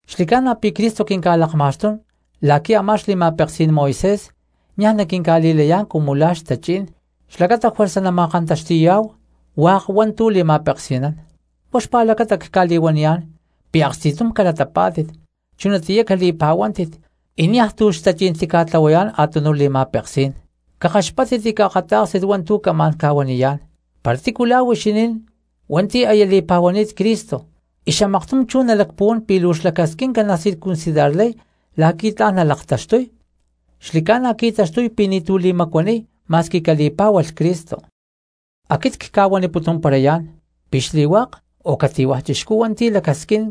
Xli̠ca̠na pi̠ Cristo quinca̠lakma̠xtún la̠qui̠ a̠má xli̠ma̠peksí̠n Moisés niaj naquinca̠li̠layá̠n cumu la̠ xtachí̠n xlacata juerza nama̠kantaxti̠yá̠hu hua̠k hua̠ntu̠ li̠ma̠peksi̠nán. Huá xpa̠lacata cca̠li̠huaniyá̠n pi̠ aksti̠tum calatapá̠tit, chunatiyá cali̠pa̠huántit, y niaj tu̠ xtachí̠n tica̠tlahuayá̠n a̠tunuj li̠ma̠peksí̠n. Cakaxpáttit y caakatá̠kstit hua̠ntu̠ camá̠n ca̠huaniyá̠n. Para tícu la̠ huixinín hua̠nti̠ aya li̠pa̠huani̠tátit Cristo y xamaktum chú nalacpuhuán pi̠ luu xlacasquinca nacircuncidarlay la̠qui̠ tla̠n nalaktaxtuy, xli̠ca̠na qui̠taxtuy pi̠ ni̠tu̠ li̠macuaniy ma̠squi cali̠pá̠hualh Cristo. Aquit cca̠huaniputumparayá̠n pi̠ xli̠hua̠k o cati̠hua̠ chixcú hua̠nti̠ lacasquín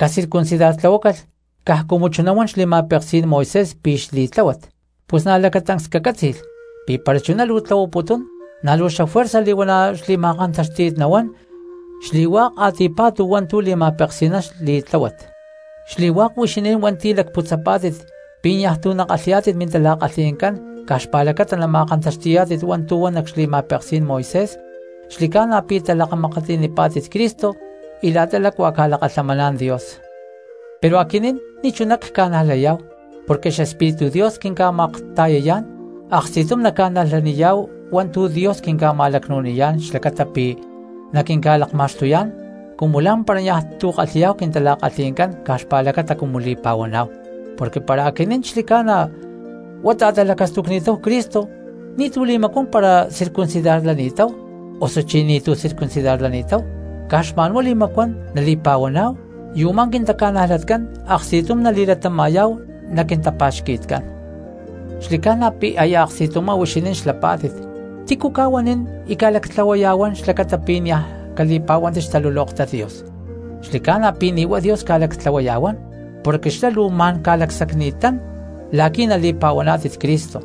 cacircuncidartlahuácalh caj cumu chuná huan xli̠ma̠peksí̠n Moisés pi̠ xli̠tláhuat, pus na̠ lacatancs cacátzi̠lh pi̠ para chuná luu tlahuaputún na̠ luu xafuerza li̠huana̠ xli̠ma̠kantáxti̠t nahuán xli̠hua̠k a̠ti̠pa̠tu hua̠ntu̠ li̠ma̠peksi̠nán xli̠tláhuat. Xli̠hua̠k huixinín hua̠nti̠ lacputzapá̠tit pi̠ niaj tu̠ nakalhi̠yá̠tit mintala̠kalhi̠ncán caj xpa̠lacata nama̠kantaxti̠yá̠tit hua̠ntu̠ huan nac xli̠ma̠peksí̠n Moisés xli̠ca̠na pi̠ talakamakatli̠nipá̠tit Cristo y la̠ta lácua ca̠lakalhamaná̠n Dios. Pero aquinín ni̠chuná ca̠najlayá̠hu porque xEspíritu Dios quinca̠makta̠yayá̠n aksti̠tum naca̠najlayá̠hu hua̠ntu̠ Dios quinca̠ma̠lacnu̠niyá̠n xlacata pi̠ naquinca̠li̠ma̠xtuyá̠n cumu lá̠mpara niaj tu̠ kalhi̠yá̠hu quintala̠kalhí̠ncán caj xpa̠lacata cumu li̠pa̠huaná̠hu. Porque para aquinín xli̠ca̠na huá ta̠talacastucni̠táhu Cristo ni̠tu̠ li̠macuán para circuncidarlani̠táhu osuchí ni̠tu̠ circuncidarlani̠táhu, caj xma̠nhuá li̠macuán nali̠pa̠huaná̠hu, y u̠má quintaca̠najlatcán aksti̠tum nali̠latama̠yá̠hu nac quintapa̠xqui̠tcán. Xli̠ca̠na pi̠ aya aksti̠tumá huixinín xlapá̠tit, ¿tícu ca̠huanín y ca̠lactlahuaya̠huán xlacata pi̠ niaj cali̠pa̠huántit xtalulóktat Dios? Xli̠ca̠na pi̠ ni̠ huá Dios ca̠lactlahuaya̠huán, porque xlá luu ma̠n ca̠lacsacni̠tán la̠qui̠ nali̠pa̠huaná̠tit Cristo.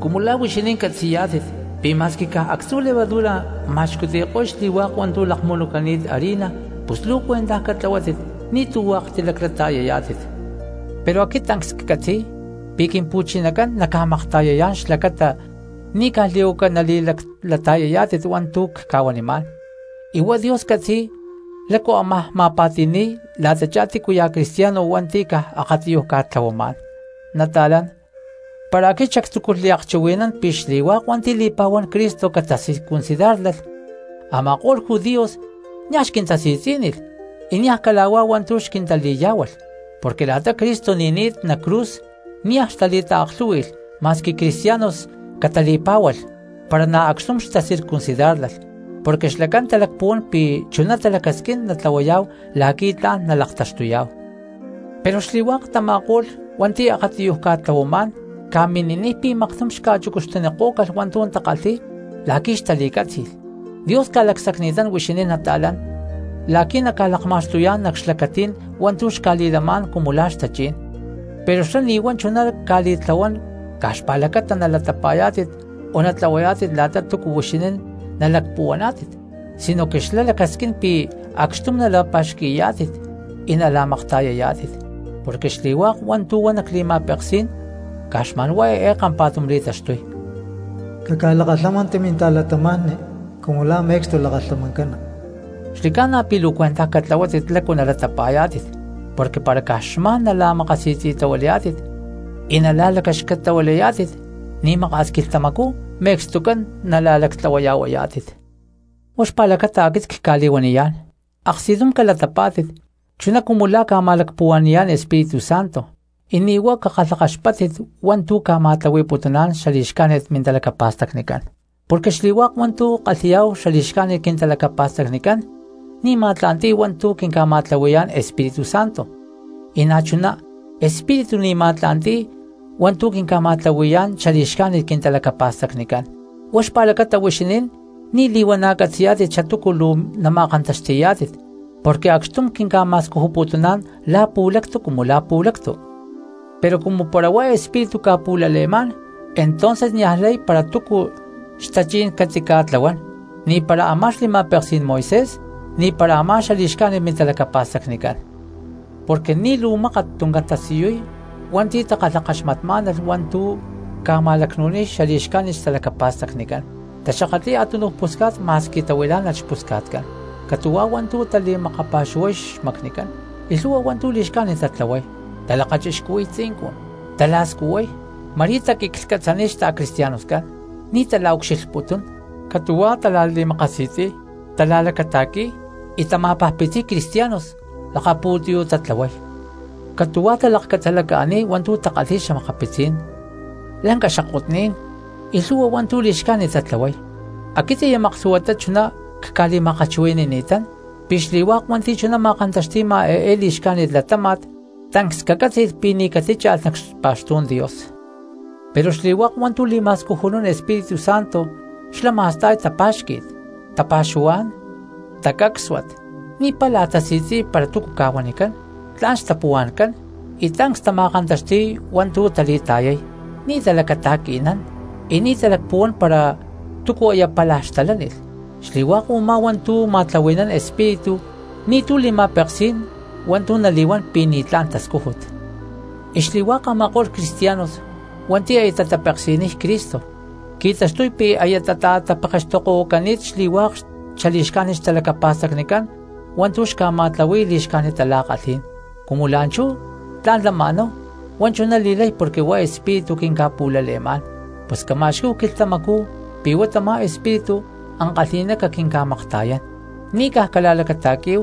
Cumu la̠ huixinín catzi̠yá̠tit pi̠ ma̠squi caj actzu̠ levadura ma̠xcuti̠ko̠y xli̠hua̠k hua̠ntu̠ lakmunucani̠t harina, pus luu cuentaj catlahuátit ni̠tu̠ hua̠k tilaclata̠yayá̠tit. Pero aquit tancs ccatzi̠y pi̠ Quimpu̠chinacán naca̠makta̠yayá̠n xlacata ni̠ caj li̠huaca nali̠laclata̠yayá̠tit hua̠ntu̠ cca̠huanimá̠n, y huá Dios catzi̠y lácu ámaj ma̠pa̠ti̠ni̠y la̠tachá tícuya̠ cristiano hua̠nti̠ caj akatiyuj ca̠tlahuamá̠n. Nata̠lán, para aquit xactzúculh liakchuhui̠nán pi̠ xli̠hua̠k hua̠nti̠ li̠pa̠huán Cristo catacircuncidárlalh, a̠ma̠ko̠lh judíos niaj xquintasi̠tzí̠nilh y niaj cala̠huá hua̠ntu̠ xquintali̠yá̠hualh. Porque la̠ta Cristo ni̠ni̠t nac cruz niaj xtali̠taaklhú̠hui̠lh ma̠squi cristianos catali̠pá̠hualh para na̠ acxtum xtacircuncidárlalh, porque xlacán talacpuhuán pi̠ chuná talacasquín natlahuayá̠hu la̠qui̠ tla̠n nalaktaxtuyá̠hu. Pero xli̠hua̠k tama̠ko̠lh hua̠nti̠ akatiyuj ca̠tlahuamá̠n ca̠mini̠niy pi̠ maktum xca̠chucu̠cti̠nikó̠calh hua̠ntu̠ takalhi̠y la̠qui̠ xtali̠cátzi̠lh. Dios ca̠lacsacni̠tán huixinín nata̠lán la̠qui̠ naca̠lakma̠xtuyá̠n nac xlacatí̠n hua̠ntu̠ xca̠li̠lamá̠n cumu la̠ xtachí̠n, pero xlá ni̠ huá chuná ca̠li̠tlahuán caj xpa̠lacata nalatapa̠yá̠tit o natlahuayá̠tit la̠ta túcu huixinín nalacpuhuaná̠tit, sinoque xlá lacasquín pi̠ acxtum nala̠pa̠xqui̠yá̠tit y nala̠makta̠yayá̠tit. Porque xli̠hua̠k hua̠ntu̠ huan nac li̠ma̠peksí̠n caj xma̠n huá eé kampa̠tum li̠taxtuy: “Caca̠lakalhámanti minta̠cristianos cumu la̠ me̠cstu lakalhamancana.” Xli̠ca̠na pi̠ luu cuentaj catlahuátit lácu nalatapa̠yá̠tit porque para caj xma̠n nala̠makasi̠tzi̠tahuilayá̠tit y nala̠lacaxcatahuilayá̠tit ni̠ maka̠s quilhtamacú me̠cstucán nala̠lactlahuayá̠tit. Huá xpa̠lacata aquit cca̠li̠huaniyá̠n, aksti̠tum calatapá̠tit chuná cumu la̠ ca̠ma̠lacpuhua̠ni̠yá̠n Espíritu Santo, y ni̠ huá cakalhakaxpáttit hua̠ntu̠ ca̠ma̠tlahui̠putuná̠n xali̠xcájnit mintalacapa̠stacnicán. Porque xli̠hua̠k hua̠ntu̠ kalhi̠yá̠hu xali̠xcájnit quintalacapa̠stacnicán ni̠ ma̠tla̠nti̠y hua̠ntu̠ quinca̠ma̠tlahui̠yá̠n Espíritu Santo, y na̠ chuná Espíritu ni̠ ma̠tla̠nti̠y hua̠ntu̠ quinca̠ma̠tlahui̠yá̠n xali̠xcájnit quintalacapa̠stacnicán; huá xpa̠lacata huixinín ni̠ li̠huana̠ catzi̠yá̠tit xatúcu luu nama̠kantaxti̠yá̠tit porque acxtum quinca̠ma̠scujuputuná̠n la̠ pu̠lactu cumu la̠ pu̠lactu. Pero cumu para huá Espíritu ca̠pu̠lale̠má̠n entonces niaj lay para túcu xtachí̠n catica̠tlahuán, ni̠para a̠má xli̠ma̠peksí̠n Moisés, na̠ ni̠para a̠má xali̠xcájnit mintalacapa̠stacnicán. Porque ni̠ luu mákat tuncán tasiyuy hua̠nti̠ takalhakaxmatmá̠nalh hua̠ntu̠ ca̠ma̠lacnu̠niy xali̠xcájnit xtalacapa̠stacnicán: taxakatli̠y a̠tunuj pusca̠t ma̠squi tahuilá̠nalh xpusca̠tcán, catu̠huá hua̠ntu̠ tali̠makapa̠xuhuay xmacnicán, y lhu̠hua hua̠ntu̠ li̠xcájnit tatlahuay, talakachixcuhui̠y tzincun, tala̠scuhuay. Ma̠rí taquiclhcatzaniy xta̠cristianoscán, ni̠ tala̠ucxilhputún; catu̠huá tala̠li̠makasi̠tzi̠y, tala̠lacata̠qui̠y, y tama̠pajpitziy cristianos lakapu̠tiyú̠ tatlahuay. Catu̠huá talakcatzalaca̠niy hua̠ntu̠ takalhi̠y xa̠makapitzí̠n, lanca xakotní̠n y lhu̠hua hua̠ntu̠ li̠xcájnit tatlahuay. Aquit aya maklhu̠huatá chuná cca̠li̠ma̠kalhchuhui̠ni̠tán pi̠ xli̠hua̠k hua̠nti̠ chuná ma̠kantaxti̠ma eé li̠xca̠jnit latáma̠t tancs cacátzi̠lh pi̠ ni̠ catitácha̠lh nac xpa̠xtú̠n Dios. Pero xli̠hua̠k hua̠ntu̠ li̠ma̠scujunún Espíritu Santo xlá ma̠sta̠y tapa̠xqui̠t, tapa̠xuhuá̠n, tacácsuat, ni̠ pála tasi̠tzi̠y para túcu ca̠huanicán, tla̠n xtapuhua̠ncán, y tancs tama̠kantaxti̠y hua̠ntu̠ tali̠ta̠yay. Ni̠ talacata̠qui̠nán, y ni̠ talacpuhuán para túcu aya pálaj xtalánilh. Xli̠hua̠k u̠má hua̠ntu̠ ma̠tlahui̠nán Espíritu ni̠tu̠ li̠ma̠peksí̠n hua̠ntu̠ nali̠huán pi̠ ni̠tlá̠n tascújut. Y xli̠hua̠k a̠ma̠ko̠lh cristianos hua̠nti̠ aya tatapeksi̠niy Cristo qui̠taxtuy pi̠ aya tata̠tapekextokotahuacani̠t xli̠hua̠k xali̠xcájnit xtalacapa̠stacnicán hua̠ntu̠ xca̠ma̠tlahui̠y li̠xcájnit tala̠kalhí̠n. Cumu la̠nchú tla̠n lama̠náhu huá chuná li̠lay porque huá Espíritu quinca̠pu̠lale̠má̠n, pus cama̠xquí̠hu quilhtamacú pi̠ huá tamá Espíritu ankalhi̠ná caquinca̠makta̠yán. Ni̠ caj cala̠lacata̠quí̠hu,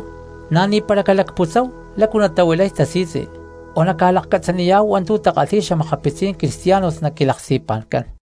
na̠ ni̠para calacputzáhu lácu natahuilay tasi̠tzi, o naca̠lakcatzaniyá̠hu hua̠ntu̠ takalhi̠y xa̠makapitzí̠n cristianos nac quilaksti̠pa̠ncán.